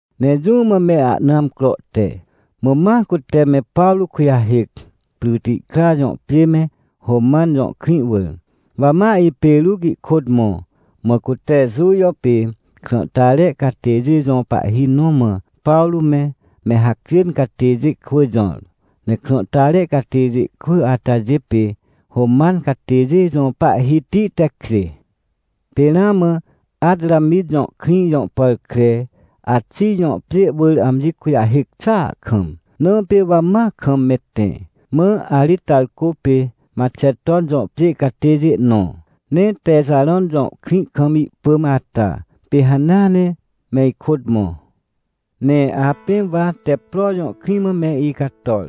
Ne jũ mã me ahna amcro te, mã ma cute me Pawrô kujahêc, Prytikra jõ pjê me, Roman jõ krĩ wỳr. Wa ma, ipê Ruc, ihkôt mõ, mã cute Jujo pê krãhtare catêjê jõ pahhi nõ mã Pawrô me, me hacjên catêjê kwỳ jõr. Ne krãhtare catêjê kwỳ atajê pê Roman catêjê jõ pahhiti tekjê. Pê ramã Atramit jõ krĩ jõ pàr kre Axij jõ pjê wỳr amji kujahêc xàa kam, na pê wa ma kam me tẽ. Mã Aritarcô pê Maxeton jõ pjê catêjê nõ, ne Texarõn jõ krĩ kam ihpỳm ata, pê hanea ne me ikôt mõ. Ne apẽ wa Teppro jõ krĩ mã me icator.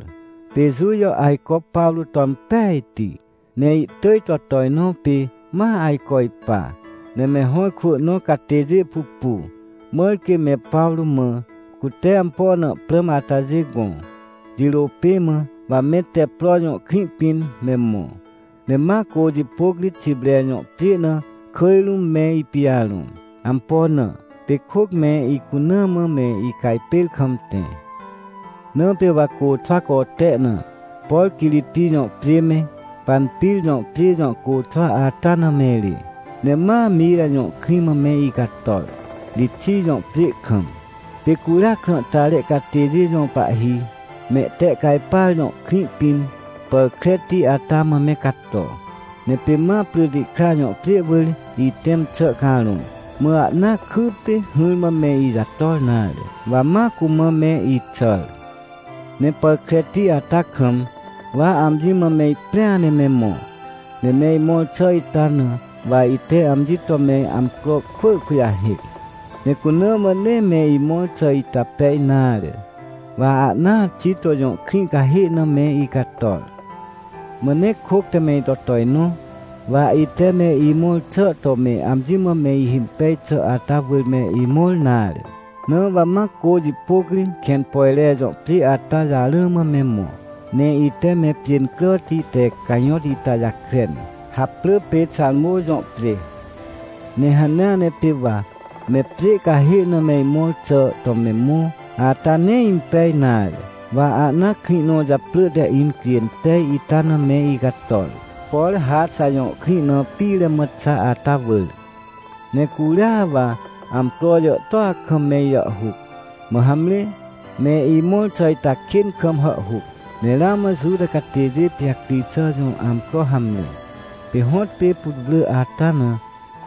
Pê Jujo ajco Pawrô to impejti, ne ihtỳj to tojnõ pê ma ajco ipa, ne me hõ ikwỳ nõ catêjê pupu, mãr quê me Pawrô mã, cute ampo na prãm atajê gõ. Jirô pê mã, wa me Teppro jõ krĩ pĩn me mõ, ne ma cô jipôc ri Xipre jõ pjê na kỳj rũm me ipijarõ. Ampo na? Pê kôc me icunaa mã me icajpêr kam tẽ. Na pê wa côxwa cote na, por Quiriti jõ pjê me, Panpir jõ pjê jõ côxwa ata na me rê. Ne ma Mira jõ krĩ mã me icator, Rixij jõ pjê kam. Pê curia krãhtare catêjê jõ pahhi, Mehtehcajpar jõ krĩ pĩn pàr kreti ata mã me cato, ne pê ma Prytikra jõ pjê wỳr ihtẽm xà carõ. Mã ahnaa kypê hỹrmã me ijator nare, wa ma cumã me ixàr. Ne pàr kreti ata kam, wa amji mã me iprĩa ne me mõ, ne me imõr xà ita na wa ite amji to me amcro kwỳ kujahêc, ne cuna mã nee me imõr xà ita pej nare, wa ahnaa Xito jõ krĩ cahê na me icator. Mã nee kôc te me ito tojnõ, wa ite me imõr xà to me amji mã me ihimpej xà ata wỳr me imõr nare, na wa ma cô jipôc ri Kẽnpojre jõ pjê ata jarã mã me mõ. Ne ite me pjê incràti te cajõt ita jakren, haprỳ pê Xarmô jõ pjê. Ne hanea ne pê wa me pjê cahê na me imõr xà to me mõ ata nee impej nare, wa ahnaa krĩ nõ japrỳ te Incjênpej ita na me icator, por Raxa jõ krĩ na pire mã xa ata wỳr. Ne curia wa amcro jàhtôa kam me ijàhhuc. Mã hamre, me imõr xà ita kên kam hàhhuc, ne ramã Juta catêjê pijacri xà jõ amcro hamre, pê hõtpê putwrỳ ata na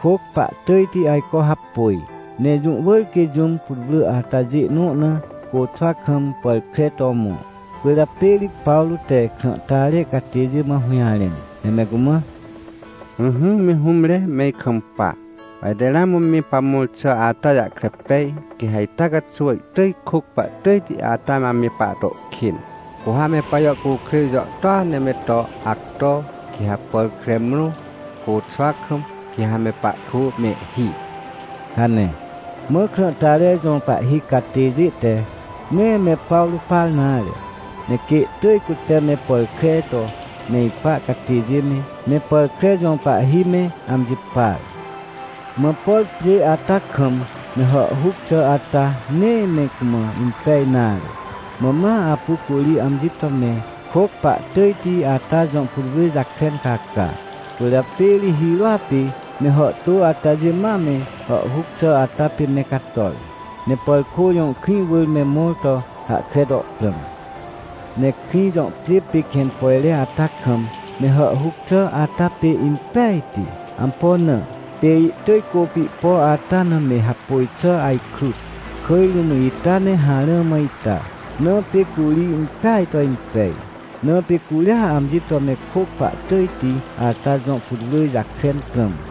kôc pahtỳjti ajco hapôj, ne jũ wỳr quê jũm putwrỳ atajê nõ na côxwa kam pàr kre to mõ. Cwỳrjapê ri Pawrô te krãhtare catêjê mã hũjarẽn, ne me cumã: — Ỹhỹ, me hũmre, me ikampa, wa ite ramã me pamõr xà ata jahkre pej, quê ha ita caxuw ihtỳj kôc pahtỳjti ata ame pahto kên. Cu ha me pajàhcukrêj jàhtôa ne me to acto, quê ha pàr kre mrõ, côxwa kam, quê ha me pahkwỳ mehhi — hane. Mã krãhtare jõ pahhi catêjê te nee me Pawrô par nare. Ne quê ihtỳj cute me pàr kre to me ipa catêjê me, me pàr kre jõ pahhi me amji par. Mã por pjê ata kam me hàhhuc xà ata, nee me cumã impej nare. Mã ma apu curi amji to me kôc pahtỳjti ata jõ putwrỳ jakren caca. Cwỳrjapê ri hirôa pê me hàhtô atajê ma me hàhhuc xà ata pê me cator, ne Pàrkô jõ krĩ wỳr me mõr to hahkre to prãm. Ne krĩ jõ pjê pê Kẽnpojre ata kam me hàhhuc xà ata pê impejti. Ampo na? Pê ihtỳj cô pihpo ata na me hapôj xà ajkrut, kỳj rũm ita ne harã mã ita. Na pê curi impeaj to impej, na pê curia amji to me kôc pahtỳjti ata jõ putwrỳ jakren prãm.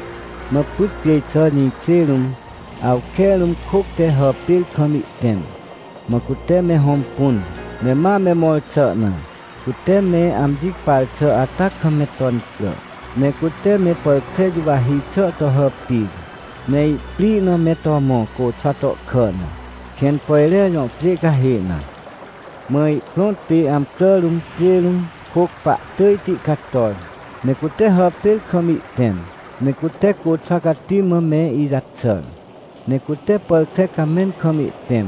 Mã pyt cjêj xà jĩkjê rũm, awke rũm kôc te hàpêr kam ihtẽm. Mã cute me hõmpun, ne ma me mõr xà na, cute me amji par xà ata kam me to incrà. Ne cute me pàr kre juwahi xà to hàpir, ne ihprĩ na me to mõ, côxwa tohkà na, Kẽnpojre jõ pjê cahê na. Mã ihprõt pê amcrà rũm, pjê rũm, kôc pahtỳjti cator, ne cute hàpêr kam ihtẽm, ne cute côxwa cati mã me ijaxàr. Ne cute pàr kre camẽn kam ihtẽm,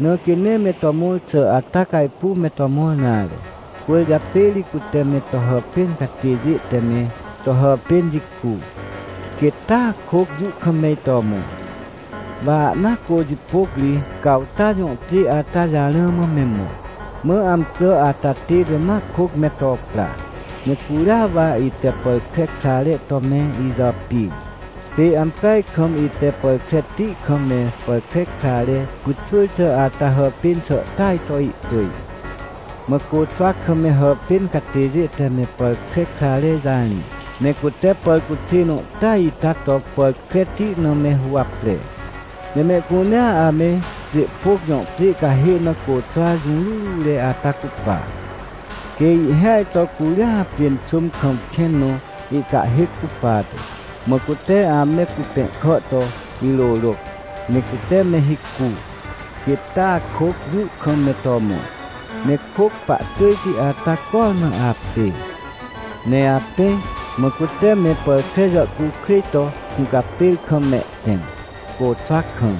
na quê nee me to mõr xà ata cajpuw me to mõr nare. Cwỳrjapê ri cute me to hàpên catêjê te me to hàpên jicu, quêt taa kôc jũ kam me ito mõ. Wa ahnaa cô jipôc ri Cawta jõ pjê ata jarã mã me mõ. Mã amcrà ata tête ma kôc me to pra. Ne curia wa ite pàr kre krare to me ijàpir, pê ampeaj kam ite pàr kreti kam me pàr kre krare pyxwỳr xà ata hàpên xà tỳaj to ihtỳj. Mã côxwa kam me hàpên catêjê te me pàr kre krare jarĩ, ne cute pàr cuxê nõ tỳaj ita to pàr kreti na me huwapre. Ne mehcunea ame Pjêhpôc jõ pjê cahê na côxwa jũrurure ata cupa. Quê ihhêaj to curia pjênxôm kam kẽn nõ ihcahhêc cupate. Mã cute ame cupẽhkà to irôrôc, ne cute me hicu, quêt taa kôc jũ kam me to mõ. Ne kôc pahtỳjti ata cormã apê. Ne apẽ, mã cute me pàr kre jàhcukrêj to hũcapêr kam mehtẽm, côxwa kam.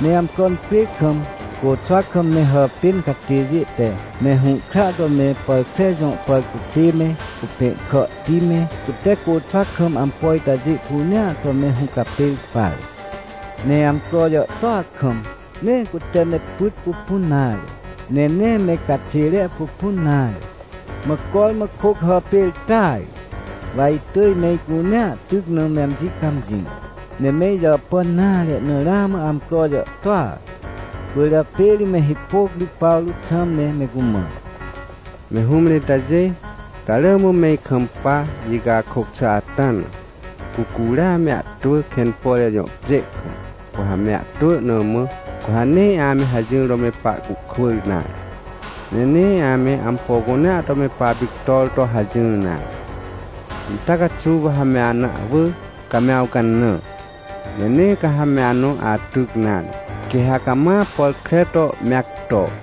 Ne amcro incrê kam côxwa kam me hàpên catêjê te me hũhkra to me pàr kre jõ pàrcuxê me, cupẽhkàhti me, cute côxwa kam ampo itajê cunea to me hũcapêr par. Ne amcro jàhtôa kam, ne cute me pyt pupun nare, ne nee me caxêre pupun nare. Mã cormã kôc hàpêr tỳaj. Wa itỳj me icunea tyc na me amji cãmjĩ. Ne me ijàpàn nare na ramã amcro jàhtôa, cwỳrjapê ri me hipôc ri Pawrô xãm ne me cumã: — Me hũmre itajê, ca rỳ mã me ikampa, icakôc xà ata na, cu curia me ahtwỳ Kẽnpojre jõ pjê kam, cu ha me ahtwỳ na mã, cu ha nee ame hajỹr to me pahcuhkwỳr nare, ne nee ame ampo cunea to me papictor to hajỹr nare. Ita caxuw wa ha me ana ahwỳ, ca me awcanã. Ne nee ca ha me anõ atyc nare. Quê ha cama pàr kre to me acto.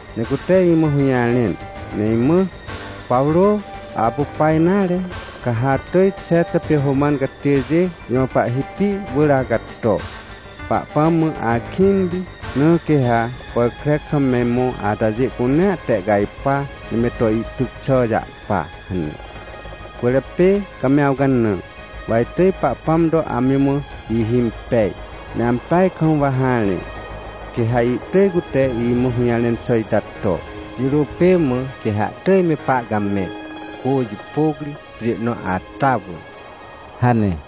Ne cute imã hũjarẽn, ne imã: “Pawrô, apu pa nare, ca ha atỳj Xexa pê Roman catêjê jõ pahhiti wỳr acato. Pahpãm mã akĩnti, na quê ha pàr kre kam me mõ atajê cunea tehcajpa, ne me to ihtyc xà jahpa” hane. Cwỳrjapê ca me awcanã, wa itỳj Pahpãm to amji mã ihimpej, ne ampeaj kam wa harẽ, quê ha ihtỳj cute imã hũjarẽn xà ita to. Jirô pê mã quê ha ihtỳj me pahcamẽ, cô jipôc ri, pjê nõ ata wỳr — hane.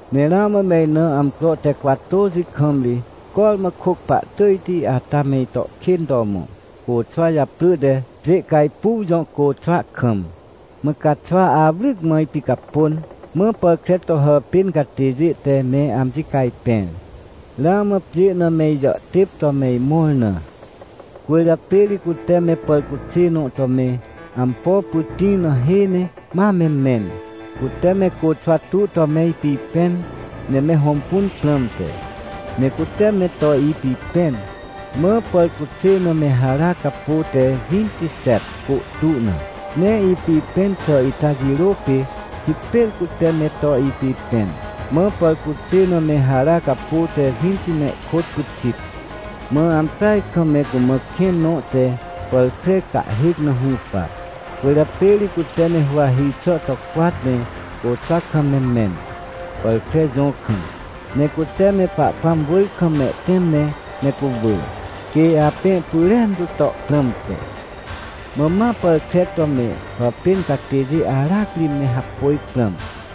Ne ramã me ina amcro te cwatôxi kam ri cormã kôc pahtỳjti ata me ito kên to mõ, côxwa japrỳ te Pjêcajpuw jõ côxwa kam. Mã caxwa awryc mã ipicapôn, mã pàr kre to hàpên catêjê te me amji cajpẽr, ramã pjê na me ijàhtêp to me imõr na. Cwỳrjapê ri cute me pàrcuxê nõ to me ampo pytĩ na hê ne ma me mẽn, cute me côxwa tu to me ipipẽn, ne me hõmpun prãmte. Ne cute me to ipipẽn, mã pàrcuxê na me hara capô te wintixet, côhtu na. Ne ipipẽn xà ita jirô pê hipêr cute me to ipipẽn, mã pàrcuxê na me hara capô te winti ne ihkôt pyxit. Mã ampeaj kam me cumã kẽn nõ te pàr kre cahhêc na hũpa. Cwỳrjapê ri cute me huwahi xà to cwat, ne côxwa kam me mẽn, pàr kre jõ kam, ne cute me Pahpãm wỳr kam mehtẽm ne me cuwỳ, quê apẽ pyrentu to prãmte. Mã ma pàr kre to me hàpên catêjê aracri me hapôj prãm,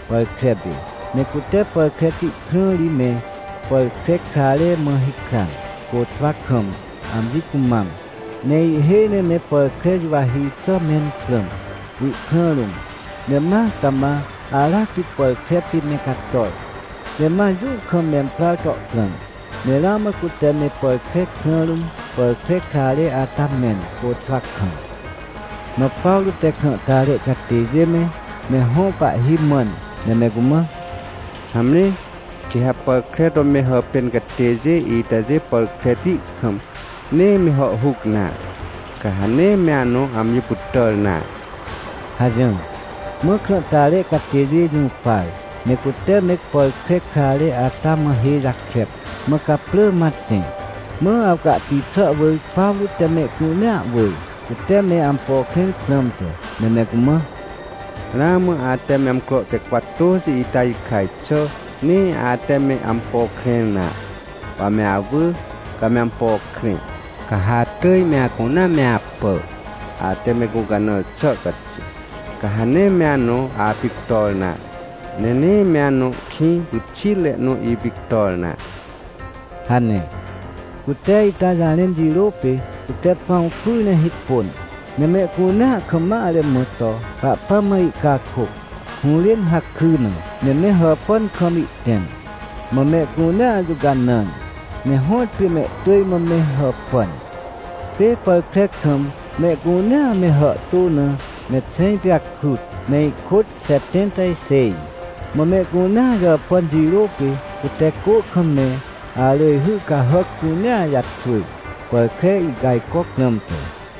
pàr kre pê. Ne cute pàr kreti krã ri me pàr kre krare mã hikran, côxwa kam, amji cumam, ne ihhêj ne me pàr kre juwahi xà mẽn prãm, ihkrã rũm, ne ma cama aracri pàr kre pê me cator, ne ma jũ kam memprar to prãm. Ne ramã cute me pàr kre krã rũm pàr kre krare ata mẽn, côxwa kam. Mã Pawrô te krãhtare catêjê me, me hõ pahhi mãn, ne me cumã: — Hamre, quê ha pàr kre to me hàpên catêjê itajê pàr kreti kam nee me hàhhuc nare, ca ha nee me anõ amji pytàr nare — hajỹr. Mã krãhtare catêjê jũpar, ne cute me pàr kre krare ata mã hê jakep, mã caprỳ ma tẽ. Mã awcahti xà wỳr Pawrô te mehcunea wỳr, cute me ampo krẽr prãmte, ne me cumã: — Ramã ate me amcro te cwatôxi ita jikaj xà, nee ate me ampo krẽr nare. Wa me awỳ, ca me ampo krẽ. Ca ha atỳj me acunea me apà, ate me gũcanãr xà caxuw. Ca ha nee me anõ apictor nare, ne nee me anõ kĩ pyxitre nõ ipictor nare — hane. Cute ita jarẽn jirô pê, cute pãw pyr ne hipôn, ne mehcunea kam mare mã to Pahpãm mã ihcakôc, hũrên hakry na, ne me hàpàn kam ihtẽm. Mã mehcunea jũcanãr, ne hõtpê mehtỳj mã me hàpàn. Pê pàr kre kam mehcunea me hàhtô na me xẽj pijakrut, ne ihkôt xetẽnta xêj. Mã mehcunea jàpàn jirô pê, cute cô kam me arỳjhy cahàc cunea jaxwỳr, pàr kre ihcajcoc prãmte.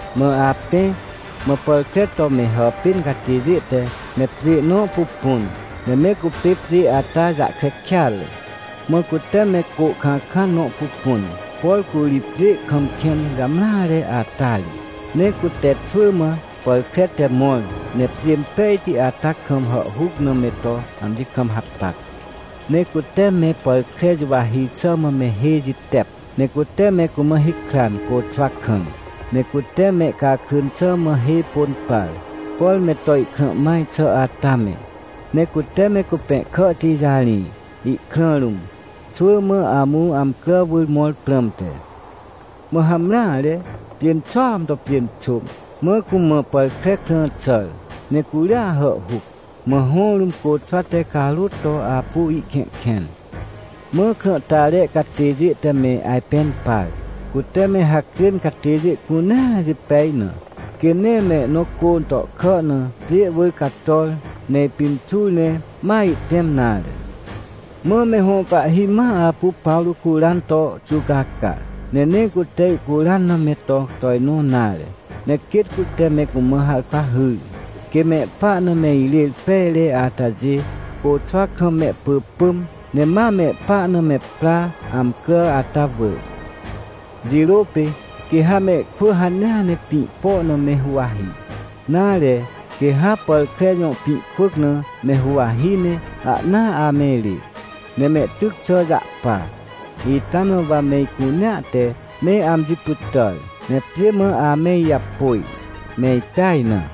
Mã apẽ, mã pàr kre to me hàpên catêjê te me pjê nõ pupun, ne me cupê pjê ata jahkre kêatre. Mã cute me cô kãkãn nõ pupun, por curi pjê kam kẽn jamreare ata ri. Ne cute xwỳ mã pàr kre te mõr, ne pjê impejti ata kam hàhhuc na me to amji kam hapac. Ne cute me pàr kre juwahi xà mã me hê jitep, ne cute me cumã hikran, côxwa kam. Ne cute mehcakrỳn xà mã hê pôn par, por me to ihkrã maj xà ata me. Ne cute me cupẽhkàhti jarĩ ihkrã rũm, xwỳ mã amũ amcrà wỳr mõr prãmte. Mã hamreare, pjênxôam to pjênxôm, mã cumã pàr kre krã xàr, ne curia hàhhuc. Mã hõ rũm côxwa te carôt to apu ihkẽhkẽn. Mã krãhtare catêjê te me ajpẽn par, cute me hacjên catêjê cunea jipej na, quê nee mehnõ cô tohkà na pjê wỳr cator, ne ipimxur ne ma ihtẽm nare. Mã me hõ pahhi ma apu Pawrô curan to xuwcaca, ne nee cute ihcuran na me to tojnõ nare. Ne quêt cute me cumã harkwa hyr, quê mehpa na me irêr pejre atajê côxwa kam mehpỳpỳm, ne ma mehpa na me pra, amcrà ata wỳr. Jirô pê quê ha mehkwỳ hanea ne pĩ po na me huwahi, nare, quê ha pàr kre jõ pĩ kwỳc na me huwahi ne ahnaa ame rê, ne mehtyc xà jahpa. Ita na wa me icunea te me amji pytàr, ne pjê mã ame ijapôj, me ipeaj na.